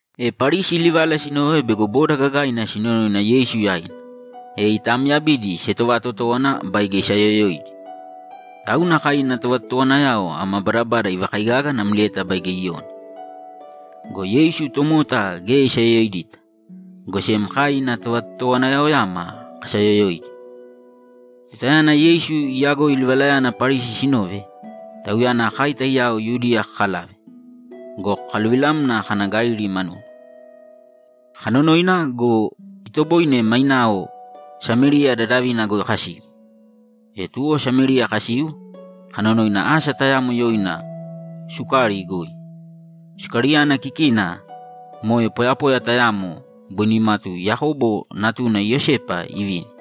E Parisi livala sinove bego boda gagaina sinonoina Yeisu yaina, e itaamyabidi sietovatotówana baige isaayoyoidi. Tauna kai ina tovatotowanayao ama badabada ivakaigaga namlieta baige Iyoni. Go Yeisu tomota geya isayoyoidita, go sem kai ina tovatotowanayaoyama kasaayoyoidi. Tutayana Yeisu iyagoi livalayana Parisi sinove, Tauyana kai taiyao Yudiya kakalave go, kakaluvilamna kana Galili manuna. Kanonoina go, itoboine mainao Samériya dadavina goi kasiu. E tuwo Samériya kasiu kanonoina asa tayamo yoina Sukari goi. Sukariyana kikina moe poyapoya tayamo boi nimatu Yakobo natuna Iyosepa ivini.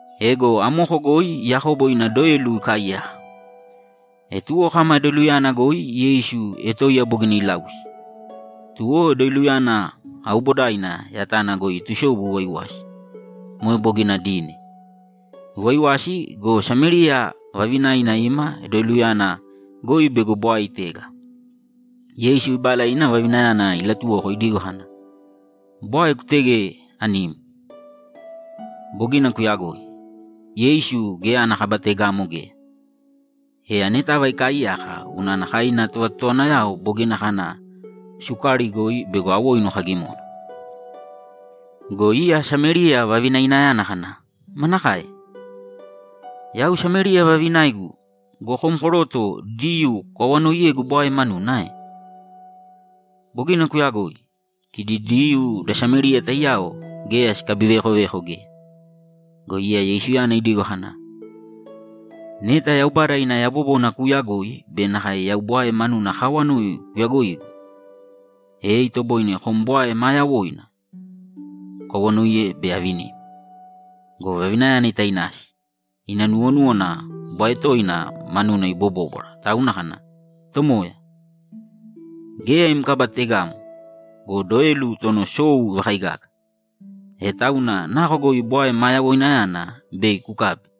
Ego amoko goi Yakobo ina doelu ikaaiyaka. E tuwo kama doeluyana goi Yeisu etoiya bogina ilausi, tuwo doeluyana aubodaina yatana goi itusobu iwaiwasi. Moe bogina dine. Iwaaiwasi go, Samériya vavinaina ima doeluyana goi bego bwae itega. Yeisu ibala ina vavinayana ilatuwoko idigo kana, ‘Bwae kutēge anim.’ Bogina kuyagoi. Yeisu geya ana kaba tegamo geya, e anetava ikaaiyaka unana kai ina tovatotowanayao bogina kana Sukari goi bego awoinu kagimona. Go iya Samériya vavinainayana kana, ‘Manakae? Yau Samériya vavinaigu go, kom koroto Diyuu kukawanoiyegu bwae manuna ae?’ Bogina kuyagoi. Kidi Diyuu da Samériya taiyao geya sikabiveekoveko geya. Go iya Yeisuyana idigo kana, ‘Neta Yaubada ina yabobona kuuyagoi be nakae yau bwae manuna akaawanoi kuyagoigu, e itoboine kom bwae maa yawoina kukawanoiye, bei avinim.’ Go vavinayana itainasi; ina nuwonúwana bwae toina manuna ibobóbwara tauna kana, ‘Tomoya, geya im kaba tegamo go, doelu tono sou ivakaigaga. E tauna nako goi bwae ma yawoinayana bei kukabi?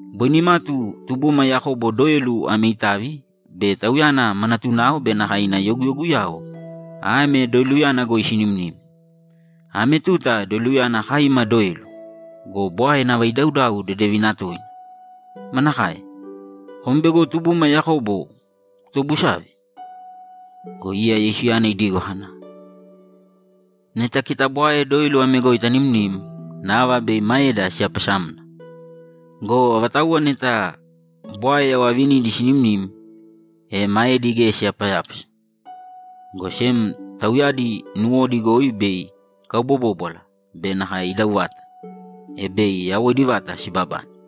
Boi nimatu tubuma Yakobo doelu ame itavi be tauyana ma natunao be nakae ina yoguyoguyao ame doeluyana goi sinimnim. Ame tuta doeluyana kai ima doelu go, bwae nava idaudau dedevina toina. Manakae, kom bego tubuma Yakobo kutobusave?’ Go iya Yeisuyana idigo kana, ‘Neta kita bwae doelu ame goi tanimnim, nava bei maeda siyapasamna go, avatauwa neta bwae yau avinidi sinimnim, e maedi geya siyapayápasa, go sem tauyadi nuwodi goi bei ikaubobóbwala be nakae idau vata, e bei yawoidi vata sibabane.’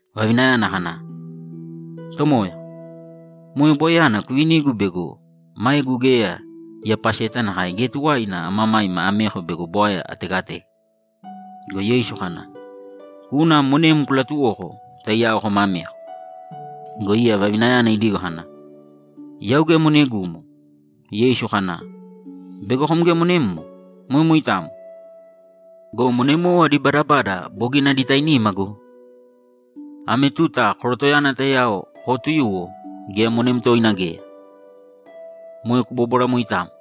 Vavinayana kana, ‘Tomoya, moe bwaeyana kuvinīgu bego maegu geya iyapaseta nakae geya tuwaina amamaima ameko bego bwae ategatega!’ Go Yeisu kana, ‘Kūna monem kulatuwōko, taiyao kōma ameko.’ Go iya vavinayana idigo kana, ‘Yau geya monegumo.’ Yeisu kana, ‘Bego kom geya monemmo? Moe moitamo. Go monemowo adi badabada bogina adi tainima go! Ame tuta korotoyana taiyao kootuyuwo geya monem toina geya. Moe kubóbwara moitamo.’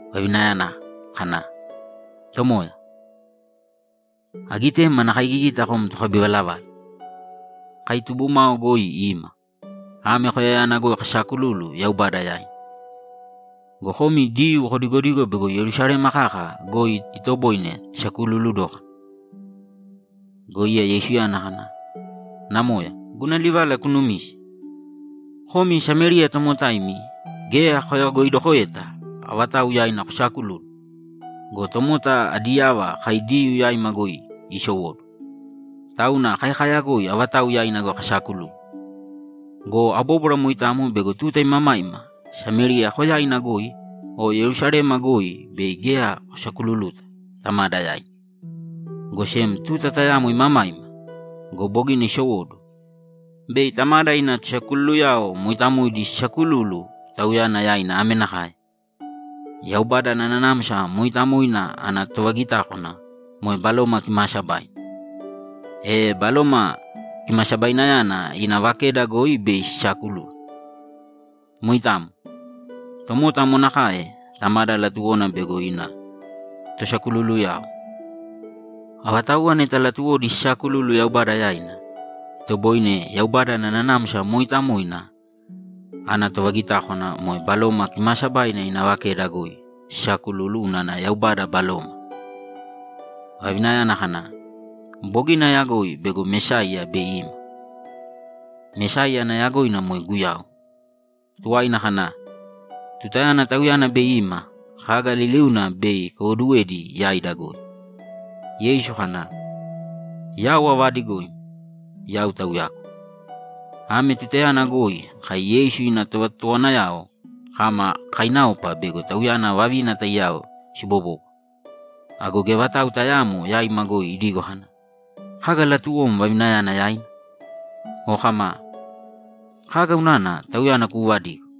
Vavinayana kana, ‘Tomoya, agitem ana kaigigita kom tokabivalavala. Kai tubumao goi ima, ame koyayana goi kasaakululu Yaubada yaina. Go komi Diyuu kodigodigo bego Yerusalema kaka goi itoboine tasakululu dókana.’ Go iya Yeisuyana kana, ‘Namoya, guna livala kunumīse! Komi Samériya tomotaimi geya koyagoidokoeta avatau yaina kosaakululu. Go tomota adi yava kai Diyuu yaima goi isowóduwo, tauna kai kaayagoi avatau yaina goi kasaakululu. Go abóbwara moitamo bego tuta imamaima Samériya koyaina goi o Yerusalema goi bei geya kosakululuta Tamada yaina, go sem tuta tayamo imamaima go, bogina isowóduwo, bei Tamada ina tosakululuyao mooitamoidi sisaakululu Tauyana yaina ame nakae: Yaubada ana Nanamsa Mooitamoina ana tovagitákwana moe Baloma Kimaasabaina, e Baloma Kimasabainayana ina vakeda goi bei sisaakululu. Moitamo. Tomota amo nakae Tamada latuwona bego ina tosakululuyao. Avatauwa neta latuwodi sisaakululu Yaubada yaina, itoboine Yaubada ana Nanamsa Mooitamoina ana tovagitákwana moe Baloma Kimaasabaina ina vakeda goi sisaakululu unana Yaubada Baloma.’ Vavinayana kana, ‘Bogina ayagoi bego Mesaiya bei ima.’ Mesaiya ana yagoina moe Guyau. Tuwaina kana, ‘Tutayana Tauyana bei ima, kaga liliuna bei ikaiwoduwedi yaida goi.’ Yeisu kana, ‘Yau avaadigoim, Yau Tauyagu.’ Ame tutayana goi kai Yeisu ina tovatotowanayao kama kakainaopa bego Tauyana vavina taiyao sibobóbwara. Ago geya vatau tayaamo yaima goi idigo kana, ‘Kaga latuwom vavinayana yaina?’ O kama, ‘Kaga unana tauyana kuuvadigo?’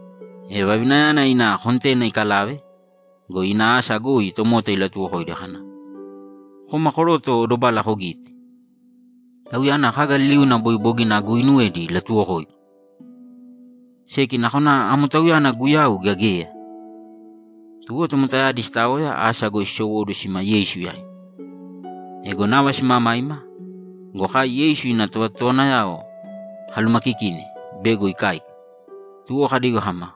E vavinayana ina kontena ikalave go, ina asa goi tomota ilatuwokoidi kana, ‘Kōma koroto dobala kogīte. Tauyana kaga liliuna boi bogina aguuinuwedi ilatuwokoigu! Seki nakona amo Tauyana Guyau gea geya?’ Tuwo tomotayadi sitaoya asa goi sisowóduwo sima Yeisu yaina. Ego nava simamaima go, kai Yeisu ina tovatotowanayao kalumakikine bego ikáika, tuwo kadigo kama,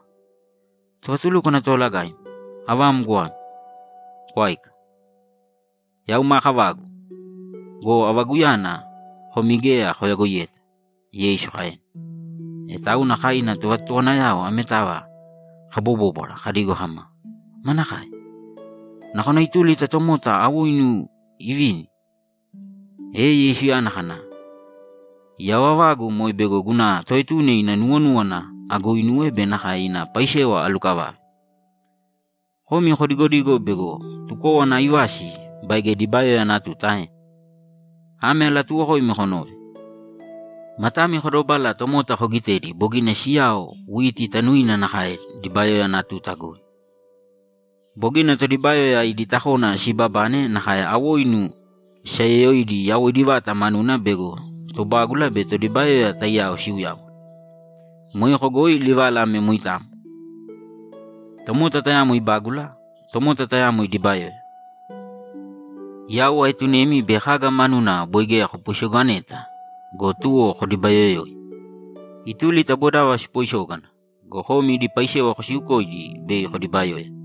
‘Tovatulúkwana Toolagaim, avam goame. Kwāika.’ ‘Yau maa kavagu go, avaguyana komi geya koyagoiyeta’, Yeisu kaena. E tauna kai ina tovatotowanayao ametava kabobóbwara kadigo kama, ‘Manakae? Nakona ituli ta tomota awoinu ivini?’ E Yeisuyana kana, ‘Yau avagu moe bego guna Toetuna ina nuwonúwana aguuinuwe be nakae ina paisewa alukavave. Komi kodigodigo bego tukówana aivasi baige dibayoya ana tuta ae? Ame alatuuwokoimi konōve: Matami kodobāla tomota kogitēdi bogina siyao witi tanuina nakae dibayoya ana tuta goi. Bogina todibayoya idi takona siibabane nakae awoinu sisayoyoidi yawoidi vata manuna bego tobágula be todibayoya taiyao siuyáwana. Moeko goi livala ame moitamo: Tomota tayamo ibágula; tomota tayamo idibayoya. Yau aetunemi bei kaga manuna boi geya kopoisoganeta go, tuwo kodibayoyoi. Ituli ta bodava sipoisógana go, komi idi paisewa kosiukoidi bei kodibayoya.’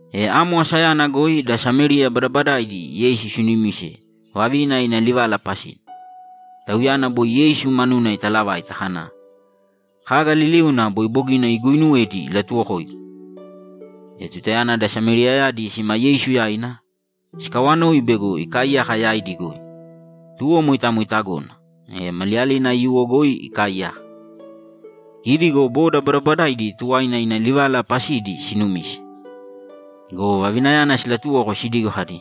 E amo asayana goi da Samériya badabadaaidi Yeisu sinumise vavina ina livala pasina. Tauyana boi Yeisu manuna italavaita kana, ‘Kaga liliuna boi bogina aguuinuwedi ilatuwokoigu!’ E tutayana da Sameriyayadi sima Yeisu yaina, sikawanoi bego ikaaiyaka yaidi goi. Tuwo moitamo itagona, e maliyalina aiyuwo goi ikaaiyaka. Kidi go boda badabadaidi tuwaina ina livala pasidi sinumise. Go vavinayana silatuwoko sidigo kadi,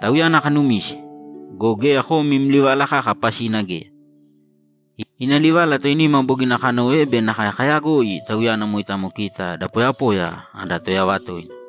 ‘Tauyana kanumise go, geya kom im livala kaka pasina geya. Ina livala toinima bogina kanove be nakae kayagoi Tauyana moitamo kita da poyapoya ada Toyava toina.’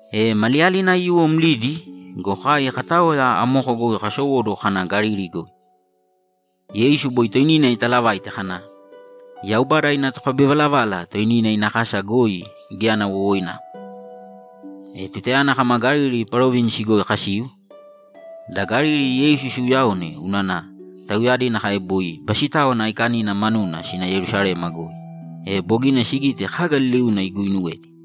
E maliyalina aiyuwo mlidi go, kai kataoya amoko goi kasowóduwo kana Galili goi. Yeisu boi toinina italavaite kana, ‘Yaubada ina tokabivalavala toinina ina kasa goi geya ana wowoinamo.’ E tutayana kama Galili Parovinisi goi kasiu, da Galili Yeisu siuyaone unana tauyadi nakae boi Basitáwana Aikanina manuna sina Yerusalema goi, e bogina sigite kaga liliuna iguuinuwedi.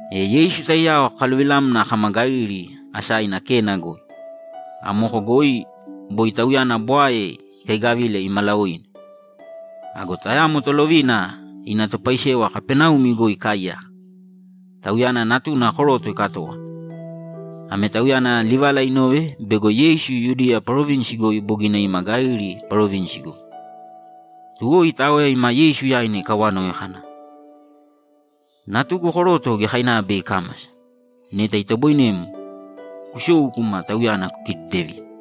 E Yeisu taiyao kakaluvilamna kama Galili asaina Kena goi. Amoko goi boi Tauyana bwae ikaigavile imalaoine. Ago tayamo tolovina ina topaisewa Kapaneumi goi ikaaiyaka; tauyana natuna koroto ikatówana. Ame tauyana livala inove bego Yeisu Yudiya Parovinisi goi bogina ima Galili Parovinisi goi. Tuwo itaoya ima Yeisu yaina ikawanoi kana, ‘Natugu koroto giyakainava bei ikámasa. Neta itoboinem, kusōu kūma tauyana kukidedevīne.’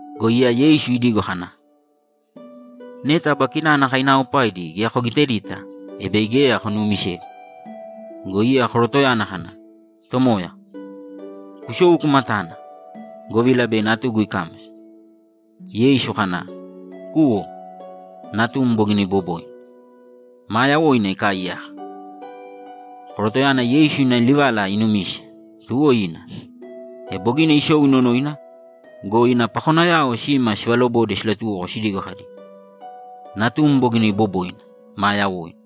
Go iya Yeisu idigo kana, ‘Neta aba kinana kainaaopaidi geya kogitedita, e bei geya konuumisegu.’ Go iya korotoyana kana, ‘Tomoya, kusōu kūma tāna, govila bei natugu ikámasa.’ Yeisu kana, ‘Kūwo. Natum bogina iboboina; maa yawoina ikaaiyaka.’ Korotoyana Yeisu ina livala inumise, tuwo ina. E bogina isou inonoina go, ina pakonayao sima sivalobode silatuwoko sidigo kadi, ‘Natum bogina iboboina, maa yawoina.’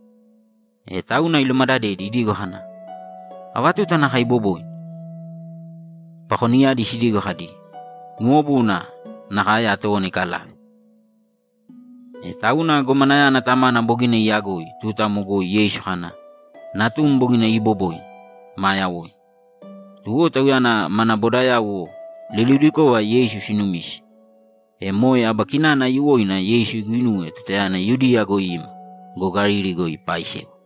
E tauna ilumadadedi idigo kana, ‘Ava tuta nakae iboboina?’ Pakonidiyadi sidigo kadi, ‘Nuwobuna nakae atówana ikalave.’ E tauna gomanayana tamana bogina iyagoi tuta amo goi Yeisu kana, ‘Natum bogina iiboboina, maa yawoina.’ Tuwo tauyana mana bodayauwo liliudikova Yeisu sinumise. E moe aba kinana aiyuwoina Yeisu iguinuwe tutayana Yudiya goi ima go, Galili goi ipaaisewa.